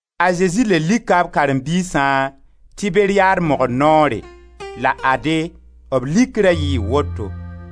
A Zezi le lika b karen-biisã Tiberiyad mogr noore la ade, b likra yɩɩ woto: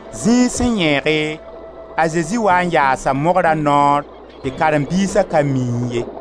Zĩig sẽn yẽege, a Zezi waa n yaasa mogra noor tɩ karen-biisa ka miẽ ye.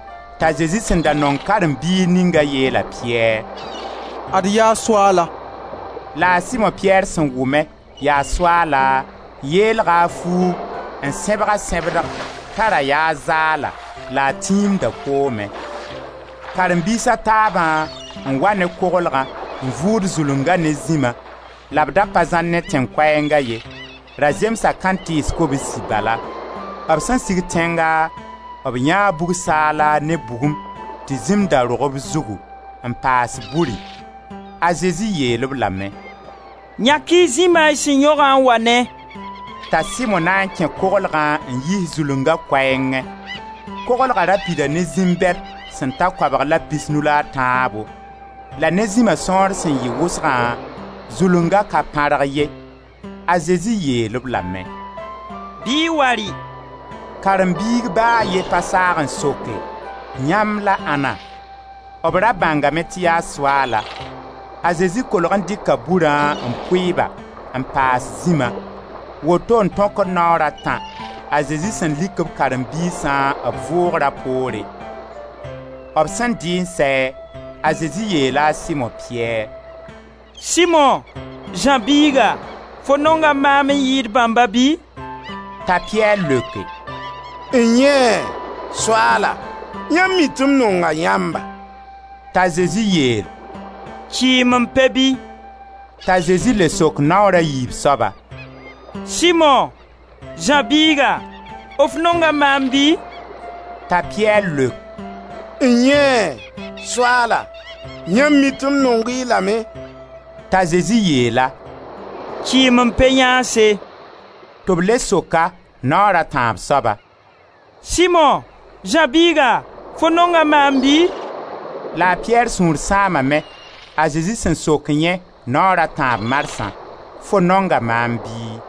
T'a Zezi sẽn da nong karen-biig ninga yeel a Piyɛr: «Ad yaa Soaala!» La a Simo-Piyɛr sẽn wʋme: «Yaa Soaala,» yeelga a fuug n sẽbg a sẽbdg t'a ra yaa a zaala la a tiimda koomẽ. Karen-biis a taabã n wa ne koglgã n vuud zulunga ne zĩma, la b da pa zãr ne tẽn-koɛɛnga ye, ra zemsa kãntɩɩs kobsi bala. B sẽn sig tẽnga, b yãee bug-saala ne bugum tɩ zĩm da rog b zugu, n paas buri. A Zezi yeel-b lame: «Yãk-y zĩma y sẽn yõgã n wa ne.» T'a Simo na n kẽ koglgã n yiis zulunga koɛɛngẽ. Koglga ra pida ne zĩm bɛd sẽn ta koabg la pisnu la a tãabo. La ne zĩma sõor sẽn yɩ wʋsgã, zulunga ka pãrg ye. A Zezi yeel-b lame: «Bɩ y wa rɩ.» Karen-biig ba a ye pa saag n soke: «Yãmb la ãnna?» B ra bãngame tɩ yaa Soaalã. A Zezi kolg n dɩka burã n pʋɩ ba, n paas zĩma. Woto n tõkd naoora tã a Zezi sẽn lik b karen-biisã b vʋʋgra poore. B sẽn dɩɩ n sɛ, a Zezi yeela a Simo-Piyɛr: «Simo, Zã biiga, fo nonga maam n yɩɩd bãmba bɩ?» T'a Piyɛr leoke: «N-yẽe! Soaala, yãmb mi tɩ m nonga yãmba.» T'a Zezi yeel: «Kɩɩm m pe-bi!» T'a Zezi le sok, naoor a yiib soaba: «Simo, Zã biiga, f nonga maam bɩ?» T'a Piyɛr leok: «N-yẽe! Soaala, yãmb mi tɩ m nong-y lame.» T'a Zezi yeel-a: «Kɩɩm m pe-yãanse!» Tɩ b le sok-a, naoor a tãab soaba: «Simo, Zã biiga, fo nonga maam bɩ?» La a Piyɛr sũur sãamame, a Zezi sẽn sok yẽ, naoor a tãab marsã: «Fo nonga maam bɩ?»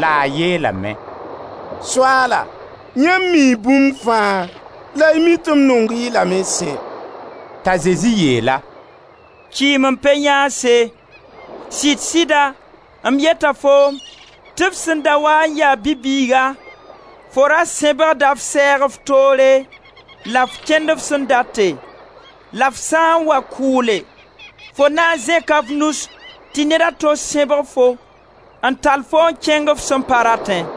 La a yeelame: «Soaala, yãmb mii bũmb fãa la y mi tɩ m nong-y lame sẽ.» T'a Zezi yeel-a: «Kɩɩm m pe-yãanse! Sɩd-sɩda m yeta foom tɩ f sẽn da waa n ya bi-bɩɩga, fo ra sẽbgda f sɛɛg f toore la f kẽnd f sẽn date, la f sã n wa kʋʋle, fo na n zẽka f nus tɩ ned a to sẽbg-fo n tall-fo n kẽng f sẽn pa ratẽ.»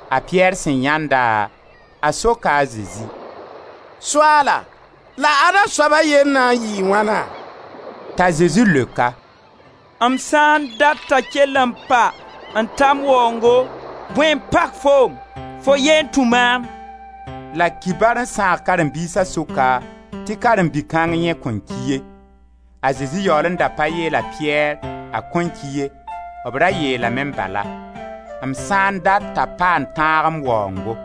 A Piyɛr sẽn yãend-a, a soka a Zezi: «Soaala, la ada-soaba yell na n yɩɩ wãna?» T'a Zezi leok-a: «M sã n dat t'a kell n pa n ta m waoongo, bõe n pak foom? Fo yee n tũ maam!» La kibar n sãag karen-biisa sʋka tɩ karen-bi-kãng yẽ kõn ki ye. A Zezi yaool n da pa yeel a Piyɛr: «A kõn ki ye,» b ra yeelame bala: «M sã n dat t'a pa n tãag m waoongo.»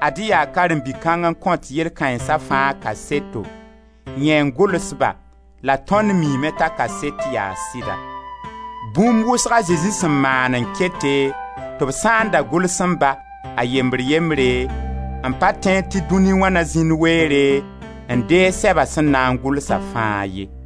Ad-y yaa karen-bi kãng n kõt yell kãensa fãa kaseto, yẽ n gʋls-ba la tõnd miime t'a kaset yaa sɩda. Bũmb wʋsg a Zezi sẽn maan n kete, tɩ b sã n da gʋlsẽ-ba, a yembr-yembre, m pa tẽed tɩ dũni wã na zĩnd weere n deeg sɛba sẽn na n gʋlsa fãa ye.